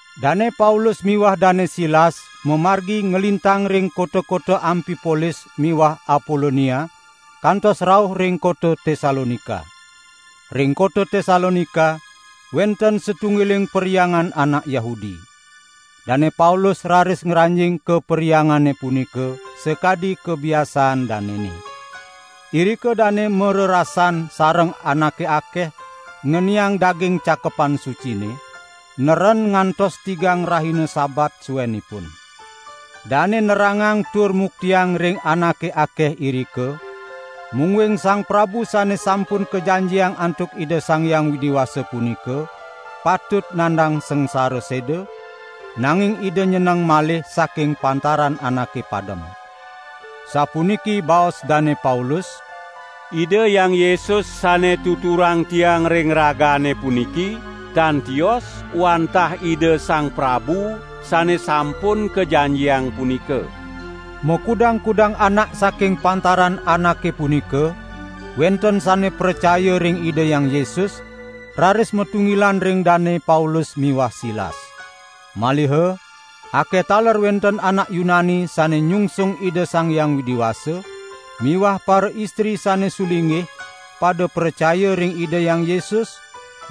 Dane Paulus miwah Dane Silas mamargi nglintang ring kota-kota Ampipolis miwah Apolonia kantos rauh ring kota Tesalonika. Ring kota Tesalonika wenten satunggiling perhyangan anak Yahudi. Dane Paulus raris ngranjing ka perhyangane punika sakadi kabiasaan danene. Irika dane marerasan sareng anake akeh ngeniang daging Cakepan Sucine, neren ngantos tigang rahina Sabat suenipun. Dane nerangang tur muktiang ring anake akeh irika, mungguing Sang Prabu Sane Sampun Kajanjiang antuk Ida Sang Hyang Widi Wasa punika, patut nandang sangsara seda, nanging Ida nyeneng malih saking pantaran anake padem. Sapuniki baos Dane Paulus: "Ida Hyang Yesus sane tuturang tiang ring ragane puniki, tan tios wantah Ida Sang Prabu Sane Sampun Kajanjiang punika." Makudang-kudang anak saking pantaran anake punika wenten sane pracaya ring Ida Hyang Yesus raris matunggilan ring Dane Paulus miwah Silas. Maliha akeh taler wenten anak Yunani sane nyungsung Ida Sang Hyang Widi Wasa miwah paraistri sane sulinggih pada pracaya ring Ida Hyang Yesus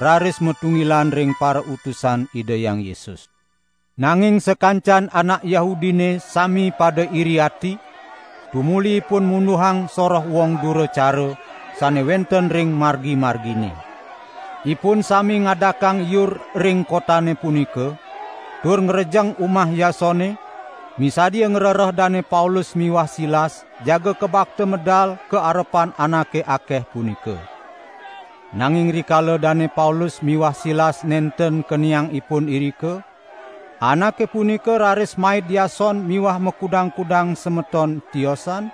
raris matunggilan ring parautusan Ida Hyang Yesus. Nanging sakancan anak Yahudine sami pada iri ati, tumuli ipun munduhang soroh wong dura cara sane wenten ring margi-margine. Ipun sami ngadakang iur ring kotane punika tur ngrejeng umah Yasone, misadia ngrereh Dane Paulus miwah Silas jaga kabakta medal ka arepan anake akeh punika. Nanging rikala Dane Paulus miwah Silas nenten keniang ipun irika, anake punika raris maid Yason miwah makudang-kudang semeton tiosan,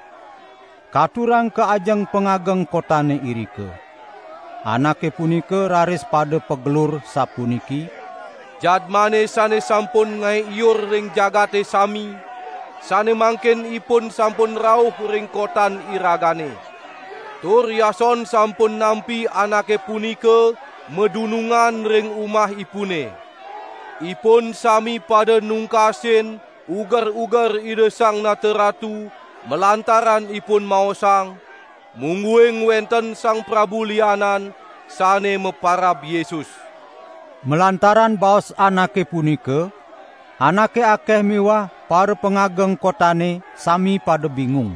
katurang ka ajeng pangageng kotane irika. Anake punika raris pada pagelur sapuniki: "Jadmane sane sampun ngae iur ring jagate sami, sane mangkin ipun sampun rauh ring kotan iragane. Tur Yason sampun nampi anake punika madunungan ring umahipune. Ipun sami pada nungkasin uger-uger Ida Sang Nata Ratu malantaran ipun maosang, mungguing wenten sang prabu lianan, sane maparab Yesus." Malantaran baos anake punika, anake akeh miwah parapangageng kotane sami pada bingung.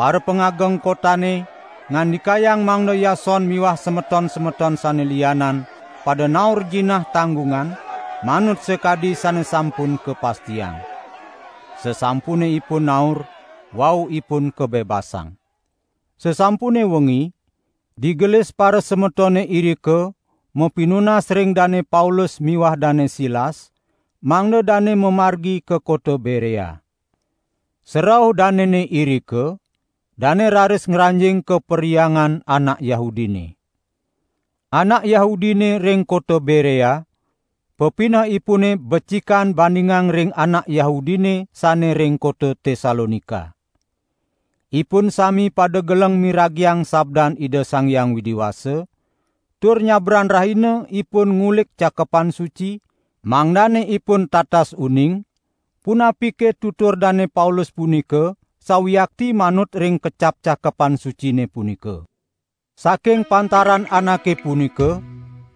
Parapangageng kotane ngandikayang mangda Yason miwah semeton-semeton sane lianan pada naur jinah tanggungan, manut sakadi sane sampun kapastiang. Sasampune ipun naur, wau ipun kabebasang. Sasampune wengi, digelis parasemetone irika mapinunas ring Dane Paulus miwah Dane Silas mangda dane mamargi ka kota Berea. Sarauh danene irika, dane raris ngranjing ka perhyangan anak Yahudine. Anak Yahudine ring kota Berea pepinehipune becikan bandingang ring anak Yahudine sane ring kota Tesalonika. Ipun sami pada geleng miragiang sabdan Ida Sang Hyang Widi Wasa, tur nyabran rahina ipun ngulik Cakepan Suci, mangdane ipun tatas uning, punapike tutur Dane Paulus punika sawiakti manut ring kecap Cakepan Sucine punika. Saking pantaran anake punika,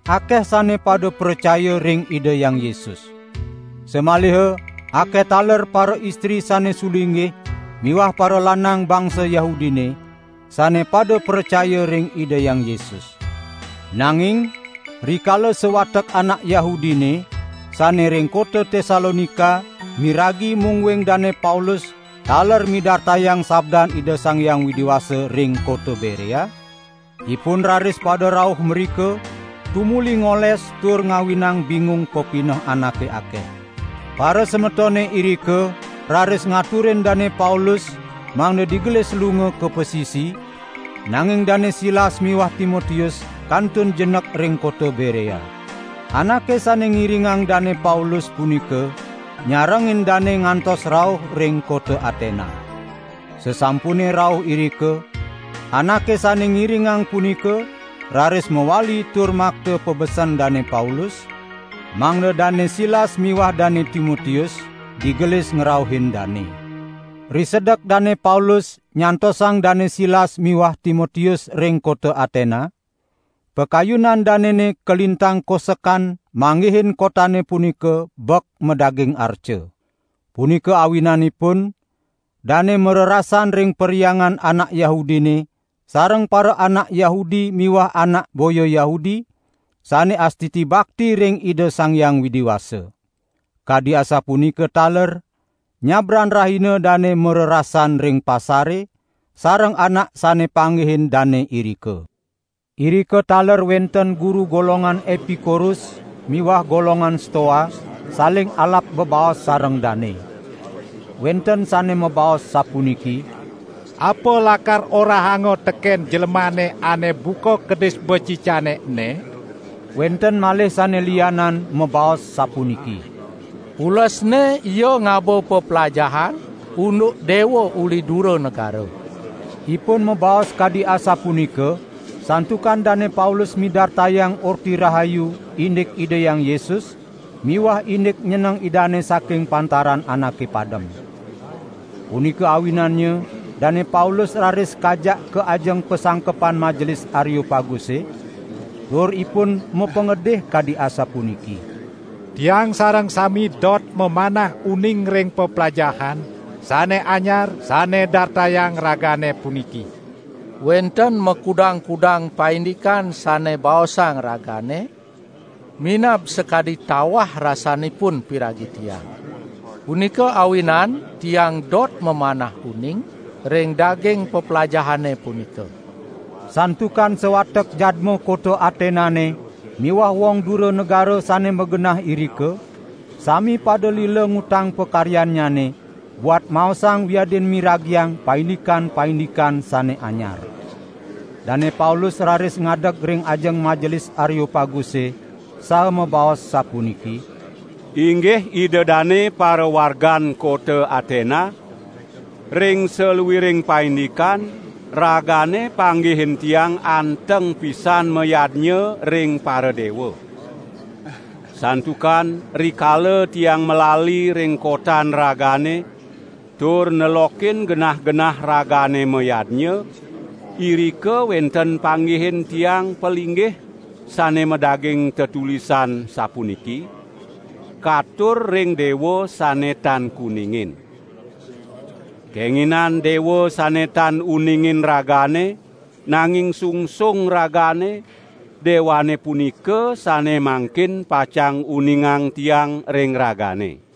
akeh sane pada pracaya ring Ida Hyang Yesus. Samaliha akeh taler paraistri sane sulinggih miwah paralanang bangsa Yahudine sane pada pracaya ring Ida Hyang Yesus. Nanging rikala sawatek anak Yahudine sane ring kota Tesalonika miragi mungguing Dane Paulus taler midartayang sabdan Ida Sang Hyang Widi Wasa ring kota Berea, ipun raris pada rauh mrika tumuli ngoles tur ngawinang bingung pepineh anake akeh. Parasemetone irika raris ngaturin Dane Paulus mangda digelis lunga ka pasisi, nanging Dane Silas miwah Timotius kantun jenek ring kota Berea. Anake sane ngiringang Dane Paulus punika nyarengin dane ngantos rauh ring kota Atena. Sasampune rauh irika anake sane ngiringang punika raris mawali tur makta pabesen Dane Paulus, mangda Dane Silas miwah Dane Timotius digelis ngrauhin dane. Risedek Dane Paulus nyantosang Dane Silas miwah Timotius ring kota Atena, pakayunan danene kalintang kosekan manggihin kotane punika bek madaging arca. Punika awinanipun dane marerasan ring perhyangan anak Yahudine sareng paraanak Yahudi miwah anak boya Yahudi sane astiti bakti ring Ida Sang Hyang Widi Wasa. Kadi asapunika taler nyabran rahina dane marerasan ring pasare sareng anak sane panggihin dane irika. Irika taler wenten guru golongan Epikuros miwah golongan Stoa saling alap bebaos sareng dane. Wenten sane mabaos sapuniki: "Apa lakar orahanga teken jlemane ane buka kedis becicane ene?" Wenten malih sane lianan mabaos sapuniki: "Ulesne ia ngaba peplajahan unduk dewa uli dura negara." Ipun mabaos kadi asapunika santukan Dane Paulus midartayang Orti Rahayu indik Ida Hyang Yesus miwah indik nyeneng Idane saking pantaran anake padem. Punika awinannya Dane Paulus raris kajak ka ajeng pasangkepan Majelis Areopaguse, tur ipun mapangedih kadi asapuniki: "Tiang sareng sami dot mamanah uning ring peplajahan sane anyar sane dartayang ragane puniki. Wenten makudang-kudang paindikan sane baosang ragane minab sakadi tawah rasanipun piragi tiang. Punika awinan tiang dot mamanah uning ring daging peplajahane punika." ( Santukan sawatek jadma kota Atenane miwah wong dura negara sane magenah irika sami pada lila ngutang pakaryannyane buat maosang wiadin miragiang paindikan-paindikan sane anyar.) Dane Paulus raris ngadeg ring ajeng Majelis Areopaguse, saha mabaos sapuniki: "Inggih ida dane parawargan kota Atena! Ring saluiring paindikan, ragane panggihin tiang anteng pisan mayadnya ring paradewa. Santukan rikala tiang malali ring kotan ragane tur nelokin genah-genah ragane mayadnya, irika wenten panggihin tiang palinggih sane madaging tetulisan sapuniki: 'Katur ring dewa sane tan kuningin.' Kenginan dewa sane tan uningin ragane, nanging sungsung ragane, dewane punika sane mangkin pacang uningang tiang ring ragane.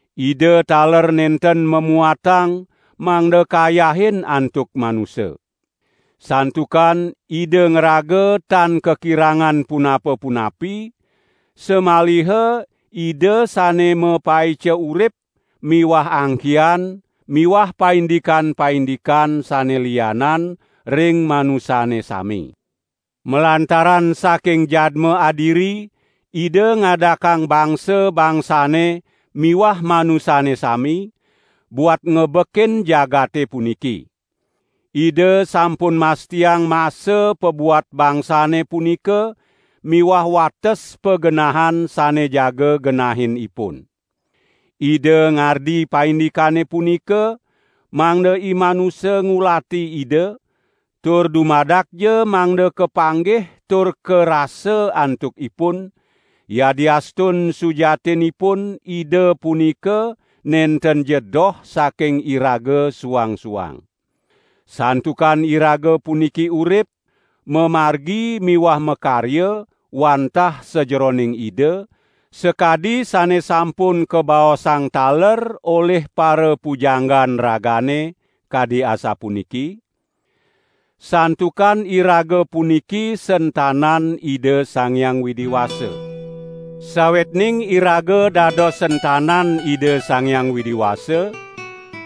Ida taler nenten mamuatang mangda kayahin antuk manusa. Santukan Ida ngraga tan kakirangan punapa-punapi, samaliha Ida sane mapaica urip miwah angkihan miwah paindikan-paindikan sane lianan ring manusane sami. Malantaran saking jadma adiri Ida ngadakang bangsa-bangsane miwah manusane sami, buat ngebekin jagate puniki. Ida sampun mastiang masa pabuat bangsane punika miwah wates pagenahan sane jaga genahin ipun. Ida ngardi paindikane punika, mangda imanusa ngulati Ida, tur dumadakja mangda kapanggih tur karasa antuk ipun, yadiastun sujatinipun Ida punika nentenja doh saking iraga suang-suang. Santukan iraga puniki urip, mamargi miwah makarya wantah sajeroning Ida, sakadi sane sampun kabaosang taler olih parapujanggan ragane, kadi asapuniki: Santukan iraga puniki sentanan Ida Sang Hyang Widi Wasa.' Sawetning iraga dados sentanan Ida Sang Hyang Widi Wasa,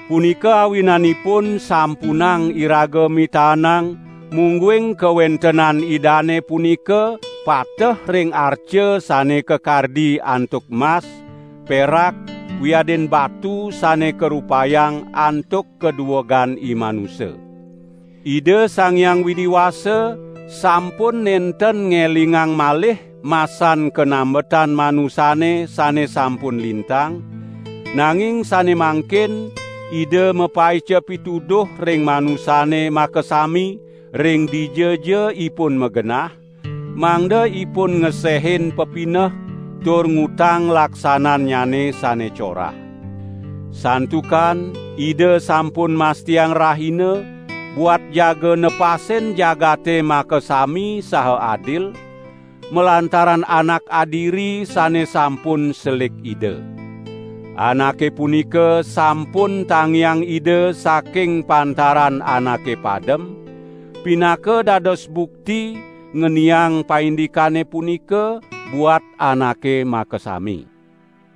punika awinanipun sampunang iraga mitaenang mungguing kawentenan Idane punika pateh ring arca sane kakardi antuk mas, perak wiadin batu sane karupayang antuk kaduegan imanusa. Ida Sang Hyang Widi Wasa sampun nenten ngelingang malih masan kanambetan manusane sane sampun lintang, nanging sane mangkin Ida mapaica pituduh ring manusane makasami, ring dijaja ipun magenah, mangda ipun ngesehin pepineh tur ngutang laksanannyane sane corah. Santukan Ida sampun mastiang rahina, buat jaga nepasin jagate makasami saha adil, malantaran Anak adiri sane sampun selik Ida. Anake punika sampun tangiang Ida saking pantaran anake padem, pinaka dados bukti ngeniang paindikane punika buat anake makasami."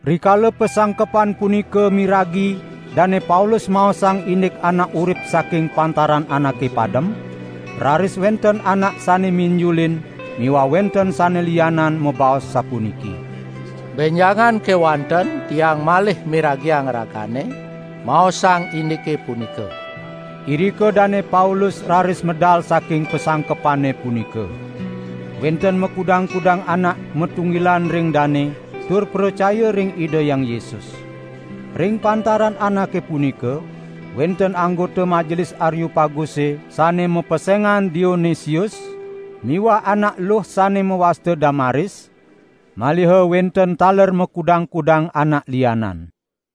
Rikala pasangkepan punika miragi Dane Paulus maosang indik anak urip saking pantaran anake padem, raris wenten anak sane minjulin miwah wenten sane lianan mabaos sapuniki: "Benjangan kewanten tiang malih miragiang ragane maosang indike punika." Irika Dane Paulus raris medal saking pasangkepane punika. Wenten makudang-kudang anak matunggilan ring dane tur pracaya ring Ida Hyang Yesus. Ring pantaran anake punika, wenten anggota Majelis Areopaguse sane mapesengan Dionesius miwah anak eluh sane mawasta Damaris, maliha wenten taler makudang-kudang anak lianan.